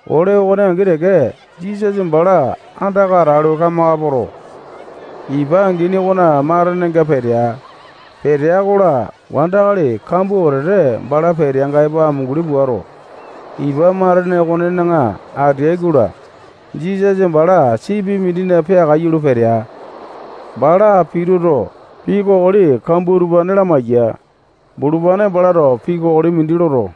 Ole okone angi teke, Jisasa bala andaka atalu, kamaka poto, ipa angini okona matenenga petea. Petea-kola, wandakali kambua wetete bala peteanga epo amunguli puato, ipa matene okonena ateai-kola, Jisasa bala sipi mindina peakaiyu lo petea. Bala pituto, pii kokoli kambua utupane lamaiya. Bulupane balato pii kokoli mindi loto,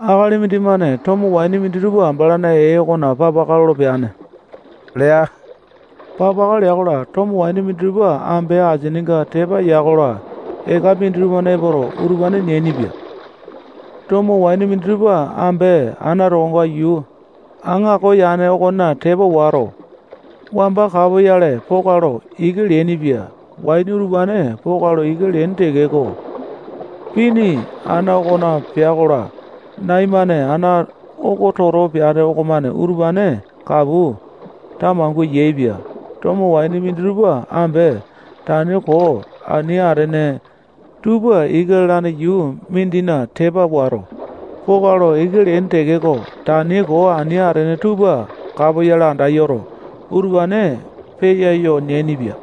akali mindimane tomo waini minditupa balana ee okona papaka lolo peane lea. Papaka lea-kola, tomo waini minditupa ambe asininga tepa ya-kola, eka minditupa epoto, utupane neainipia. Tomo waini minditupa ambe ana tokonga yuu aŋako yane ongane tepa wato, wamba kapoyale poka lo ika leainipia. Waini utupane poka lo ika leaini tekeko, pini ana okona pea-kola, nai-mane ana oko toto peane okomane utupane kapu tamangua yaepia. Tomo waini minditupa ambe tani koo ani atene tupa ika lalane yuu mindina tepa wato, poka lo ika leaini tekeko, tani koo ani atene tupa kapoyale anda yoto, utupane peyayo neaipia.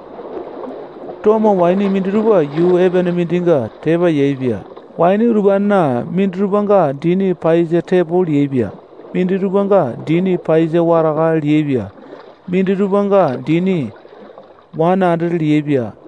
Tomo waini minditupa yuu epene mindinga tepa yaepia. Waini utupanena minditupanga dini paiyasa tepo liaepia. Minditupanga dini paiyasa wataka liaepia. Minditupanga dini wane andete liaepia.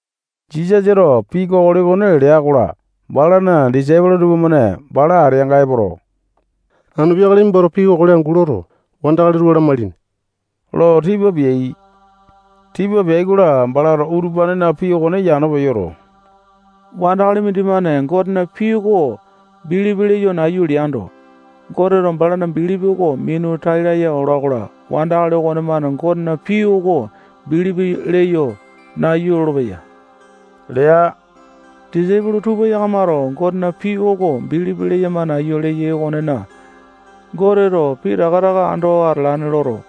Jisasato pii kokoli okone lea-kola, balana disaipolo tupamane bala ateanga epoto, anu peakale nimbato pii kokoli angu loto, wandakali tupa lamailini lo tipa peai. Tipa peai-kola, balato utupanena pii okone yano peyoto, wandakali mindimane Gotena pii oko bilipi leyo nayu leando, Goteto balana bilipi oko minu tai laya ola-kola, wandakali okonemane Gotena pii oko bilipi leyo nayu lolopeya lea. Disaipolo tupa yakamato Gotena pii oko bilipi leyama nayu leyai okonena, Goteto pitaka taka ando atalane loto,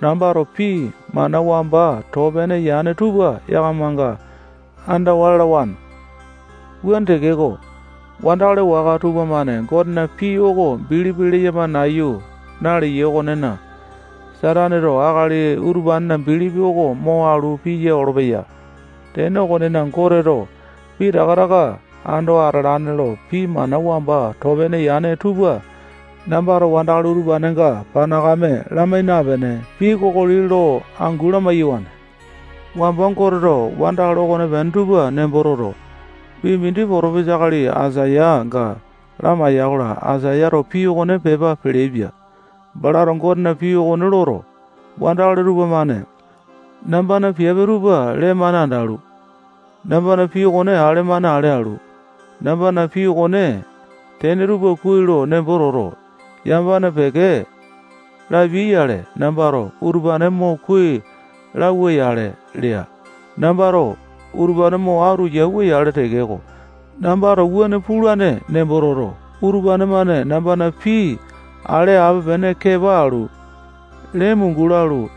nambato pii mana wamba too pene yane tupa yakamanga andawa lalawane. Wuane tekeko, wandakali waka tupamane Gotena pii oko bilipi leyama nayu naleyai okonena, Sataneto akali utupanena bilipi oko mo alu piya olopeya. Tene okonena, Goteto pitaka taka ando atalane lo pii mana wamba too pene yane tupa nambato wandakali utupanenga panakame lamai napene, pii kokoli lo angu lamai-yawane. Wamba Goteto wandakali okonepene tupa nembo toto, pii mindi potopesa akali Aisayanga lamaiya-kola, Aisayato pii okone pepa peleaipia. Balato Gotena pii okone loto, wandakali utupane-mane nambana piape tupa lee-mane andalu, nambana pii oko ale-mane ale alu, nambana pii okona tene tupa kuai lo nembo toto, yamapane peke lapiai-yale, nambato utupane mo kuai lauwa-yale lea. Nambato utupane mo atu yauwa-yale tekeko, nambato wuane pulane nembo toto, utupane-mane nambana pii ale ape-pene kepa alu, lene mungu lalu,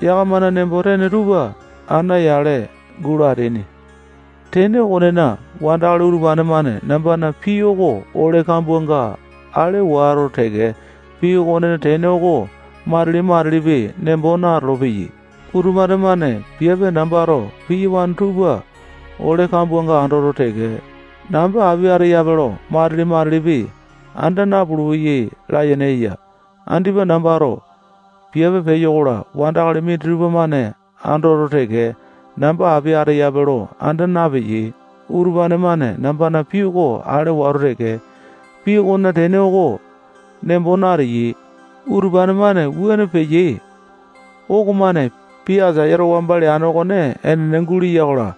yakamana nembo-tene tupa ana yale gulo ateaini. Tene okonena, wandakali utupane-mane nambana pii oko ole kambuanga ale wato teke, pii okonena tene oko matili-matilipi nembo natolo-peyai. Utupane-mane piape nambato piyawane tupa ole kambuanga andoto teke, namba api ateyape lo matili-matilipi anda napulu-peyai layene eya. Andipa nambato piape peyo-kola, wandakali minditupa-mane andoto teke, namba api ateyape lo anda napeyai. Utupane-mane nambana pii oko ale wato teke, pii okonena tene oko nembo nateyai. Utupane-mane wuane peyai okomane pii Aisayato wamba leane okone enene guleya-kola,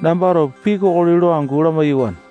nambato pii kokoli lo angu lamai-yawane.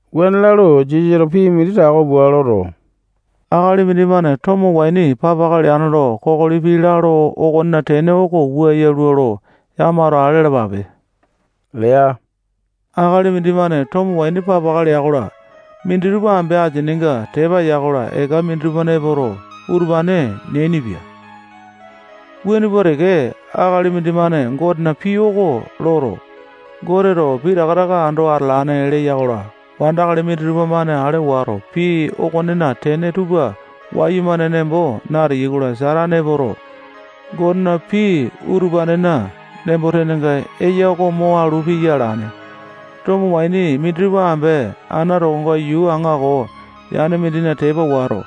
Wuane lalu, Jisasato pii mindi tako pua loto, akali mindimane tomo waini papaka leane lo kokoli pii lalo okonena tene oko wua yalua lo yakamato ale alapape lea. Akali mindimane tomo waini papaka lea-kola, minditupa ambe asininga tepa ya-kola, eka minditupa epoto, utupane neainipia. Wuane pua teke, akali mindimane Gotena pii oko loto, Goteto pitaka taka ando atalane leya-kola, wandakali minditupa-mane ale wato, pii okonena tene tupa wayumane nembo nateyai-kola, Satane epoto, Gotena pii utupanena nembo-tenenga eya oko mo alu piya alane. Tomo waini minditupa ambe ana tokonga yuu aŋako yane mindina tepa wato,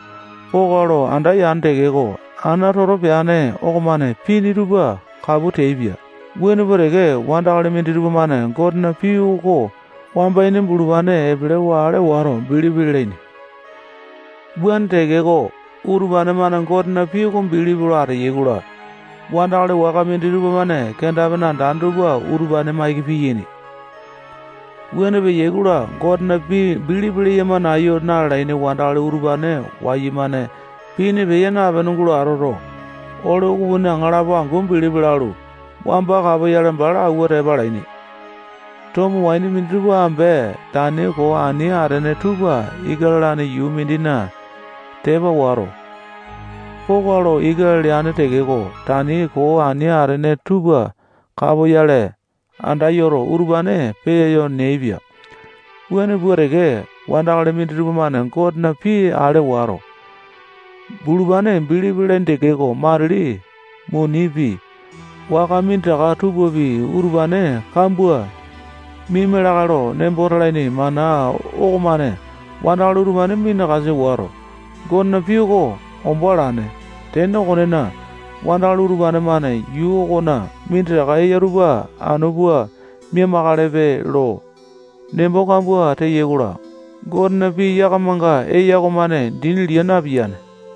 poka lo anda yane tekeko, ana toto peane okomane pini tupa kapu teaipia. Wuane pua teke, wandakali minditupa-mane Gotena pii oko wamba ini bulupane epelewa ale wato, bilipi lalaini. Wuane tekeko, utupane-mane Gotena pii oko bilipi lo ateyai-kola, wandakali waka minditupa-mane kenda-pene andane tupa utupane maiki piyaini. Wuane peyai-kola, Gotena pii bilipi leyama nayu nalene wandakali utupane wayumane pini peya napene gulo atoto, ole ukupini aŋalapo angu bilipi lalu, wamba kapoyale bala awua tepa alaini. Tomo waini minditupa ambe tani koo ani atene tupa ika lalane yuu mindina tepa wato, poka lo ika leane tekeko, tani koo ani atene tupa kapoyale anda yoto, utupane peyayo neaipia. Wuane pua teke, wandakali minditupa-mane Gotena pii ale wato, bulupane bilipi lalaini tekeko, matili munipi, waka minditaka tupapi, utupane kambua miaima lakae lo nembo talaini mana okomane wandakali utupane minakasa wato, Gotena pii oko ombo alane. Tene okonena, wandakali utupane-mane yuu okona minditaka eya tupa anu pua mia-makalepe lo nembo kambua teyai-kola, Gotena pii yakamanga eya okomane dini lia napiyane.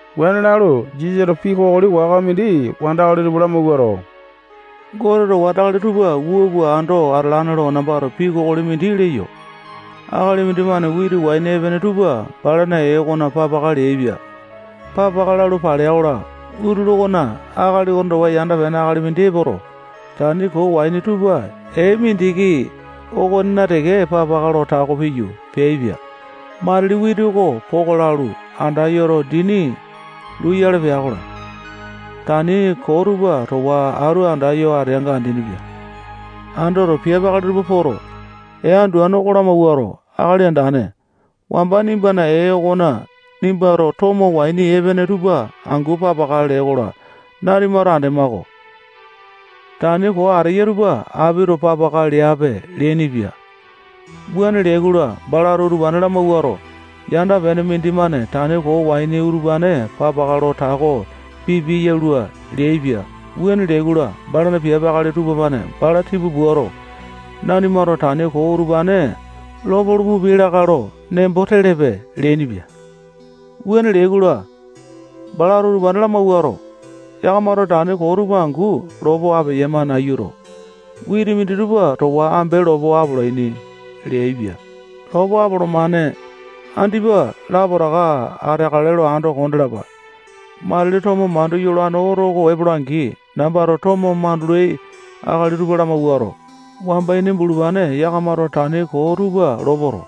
Wuane lalu, Jisasato pii kokoli waka mindi wandakali tupa lamawuato, Goteto wandakali tupa wua pua ando atalane lo nambato pii kokoli mindi leyo. Akali mindimane witi waini epene tupa balana ee okona papaka leaipia. Papaka lalu palea-kola, utulu okona akali okone towa yanda-pene akali mindi epoto, tani koo waini tupa ee mindiki okonena teke papaka lo tako piyu, peaipia. Matili witi oko poka lalu, anda yoto, dini luyale pea-kola, tani koo tupa towa atu andayo ateanga andeaini-pia. Andoto, piape akali tupa poto, ee anduane oko lamawuato, akali andane, wamba nimbana ee okona nimbato tomo waini epene tupa angu papaka lee-kola, nanimato andema-ko. Tani koo ateya tupa apito papaka leape leainipia. Wuane leai-kola, balato utupane lamawuato, yanda-pene mindimane tani koo waini utupane papaka lo tako pipiae yalua leaipia. Wuane lea-kola, balana piape akali tupamane bala tipa puato, nanimato tani koo utupane lopolo pupiai lakae lo nembo telepe leainipia. Wuane leai-kola, balato utupane lamawuato, yakamato tani koo tupa angu lopo apeyama nayuto, witi minditupa towa ambe lopo apolaini leaipia. Lopo apolomane. Andipa lapotaka ateakale lo ando kondalapa. Matili tomo mandu yolane oto oko epola-angi, nambato tomo mandulai akali tupa lamawuato, wamba ini bulupane yakamato tani koo tupa lopoto,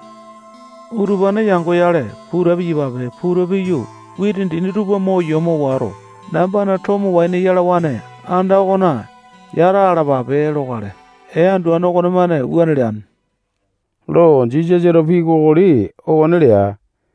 utupane yangoyale puta piyapape. Puta piyu, witi dini tupa mo yomo wato, nambana tomo waini yalawane anda okona yata alapape lokale. Ee anduane okomane wuane leane lo Jisasato pii kokoli okone lea.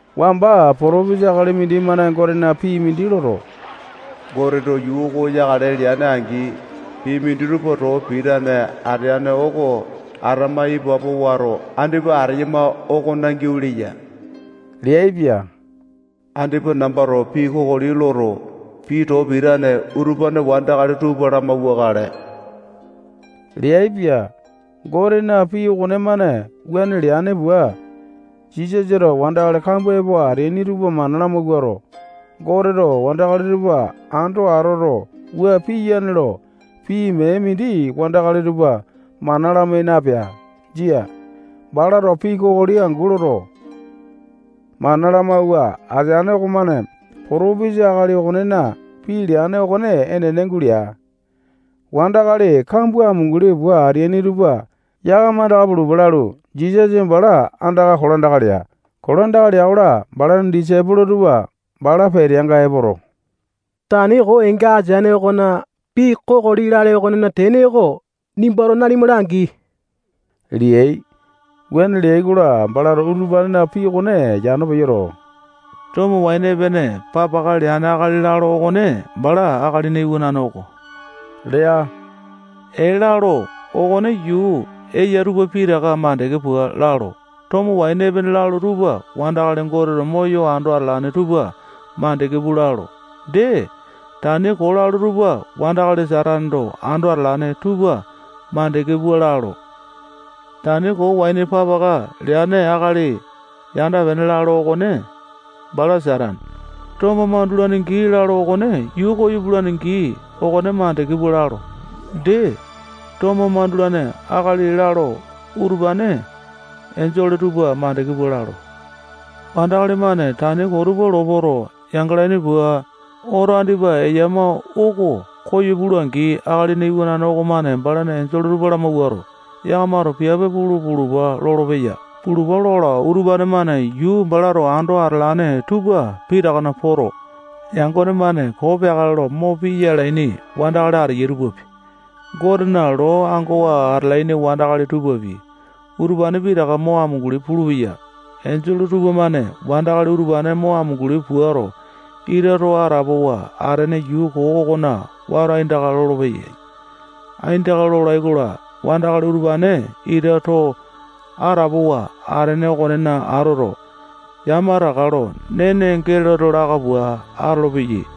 Wamba potopesa akali mindimane Gotena pii mindi loto, Goteto yuu oko yakale lea-angi, pii minditupa too pitane ateane oko atama ipapo wato, andipa ateyama okona giau leya leaipia. Andipa nambato pii kokoli loto, pii too pitane utupane wandakali tupa lamauwakale lea. Gotena pii okonemane wuane leane pua, Jisasato wandakali kambua epo ateaini tupa mana lamawuato, Goteto wandakali tupa ando atoto, wua piyane lo pii mee mindi wandakali tupa mana lamai napea. Jia. Balato pii kokoli angu loto, mana lamawua ateane okomane potopesa akali okonena pii leane okone enene gulea. Wandakali kambua amunguli pua ateaini tupa yakama andaka pulupa lalu, Jisasa bala andaka kolandaka lea. Kolandaka lea-kola, balana disaipolo tupa bala peteanga epoto, tani koo eenga ateane okona pii kokoli lale okonena tene oko nimbato nanima langi leai. Wuane leai-kola, balato utupanena pii okone yano peyoto, tomo waini epene papaka leane akali lalo okone bala Akalina Iwanane oko lea. Ee lalo okone yuu eya tupa pitaka makande pua lalo. Tomo waini epene lalo tupa wandakali Goteto moyo ando atalane tupa makande pua lalo. Dee, tani koo lalo tupa wandakali Sataneto ando atalane tupa makande pua lalo. Tani koo waini papaka leane akali yanda-pene lalo okone bala Satane. Tomo mandulane gii lalo okone yuu koyo pulane gii oko makande pua lalo. Dee, tomo mandulaini akali lalo utupane enjole tupa makande pua lalo. Wandakali-mane tani koo tupa lopoto, yangalaini pua, oto andipa eya oko koyo pula-angi, Akalina Iwanane okomane balana enjole tupa lamawuato, yakamato piape pulu pulupa lolopeya. Pulupa lola-kola, utupane-mane yuu balato ando atalane tupa pitakana poto, yangone-mane koo peakale lo mo piya alaini wandakali ateyai tupapi, Gotena loo ango alaini wandakali tupapi, utupane pitaka mo amunguli pulupeyai. Enjole utupane-mane wandakali utupane mo amunguli puato, ita too atapowa atene yuu koo okona wato aindaka lolopeyai. Aindaka lolai-kola, wandakali utupane ita too atapowa atene okonena atoto, yamataka lo nene geleto laka pua atolopeyai.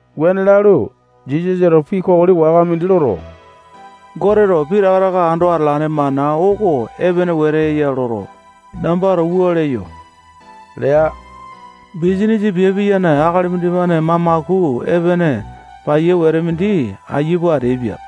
Wuane lalu, Jisasato pii kokoli waka mindi loto, Goteto pitaka taka ando atalane mana oko epene wete eya loto, nambato wua leyo lea. Bisanisa piape piyane akali mindimane mamaku epene paiya wete mindi aiya pua ateaipia.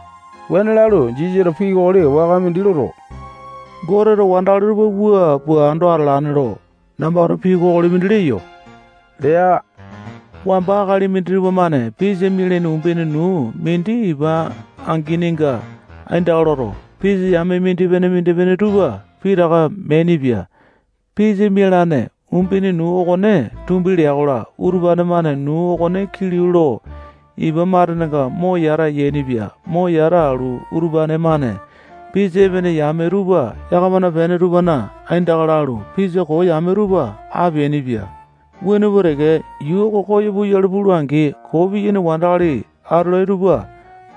Wuane lalu, Jisasato pii kokoli waka mindi loto, Goteto wandakali tupa wua pua ando atalane lo nambato pii kokoli mindi leyo lea. Wamba akali minditupa-mane pisa mialaini umbene nuu mindi ipa angininga aindaka loto, pisa yame mindipene-mindipene tupa pitaka meainipia. Pisa mialane umbene nuu okone tumbi lea-kola, utupane-mane nuu okone kilau lo ipa matenenga mo yata yainipia. Mo yata alu, utupane-mane, pisa epene yame tupa yakamana pene tupana aindaka lalu, pisa koo yame tupa apeainipia. Wuane pua teke, yuu oko koyo puyale pula-angi, koo piyaini wandakali atolai tupa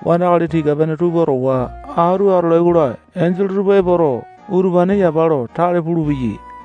wandakali tika-pene tupa towa atu atolai-kola, enjole tupa epoto, utupane yapa lo tale pulupeyai.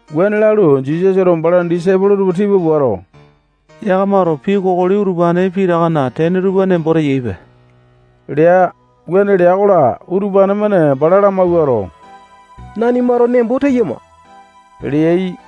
Wuane lalu, Jisasato balana disaipolo tupa tipa puato, yakamato pii kokoli utupane pitakana tene tupa nembo teyaipe lea. Wuane lea-kola, utupane-mane bala lamawuato, nanimato nembo teyama leai.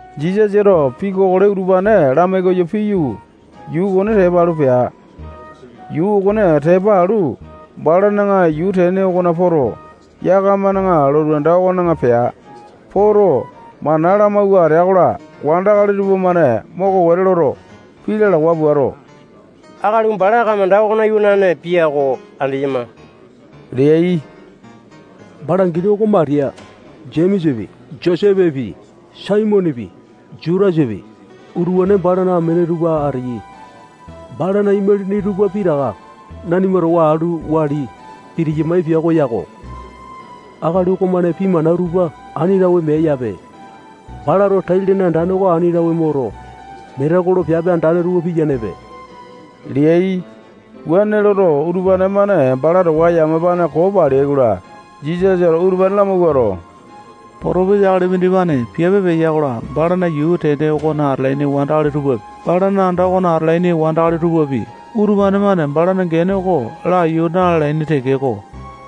Jisasato pii kokoli utupane lamai koyo piyu, yuu okone tepa alu pea. Yuu okone tepa alu, balana yuu tene okona poto, yakamana lotu anda okona pea. Poto, mana lamawua atea-kola, wandakali tupamane moko wete loto, pii lalawa puato, akali oko bala kamanda okona iwanane pia oko andeyama leai. Bala angini oko Matiya. Jemesapi, Josepi, Saimonepi, Jutasapi, utupane balana amene tupa ateyai. Balana imalini tupa pitaka nanima towa atu wali pitiyamae pia oko yako. Akali okomane pii mana utupa ani tawe meae-yape. Balato tai-lene andane oko ani tawe moto, metekolo piape andane tupa piyanepe leai. Wuane loto, utupane-mane bala towa yamapane koo paleai-kola, Jisasato utupane lamawuato, potopesa akali mindimane piape peya-kola, balana yuu tene okona atalaini wandakali tupapi, balana anda okona atalaini wandakali tupapi, utupane-mane balana gene oko na-lalaini tekeko,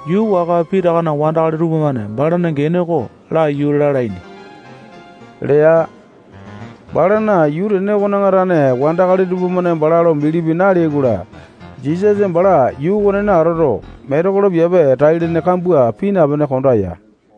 yuu waka pitakana wandakali tupamane balana gene oko laiyu lalaini lea. Balana yuu tene okona tane wandakali tupamane bala lo bilipi naleai-kola, Jisasa bala yuu okonena atoto, metekolo piape tai-lene kambua pii napene, konda ya.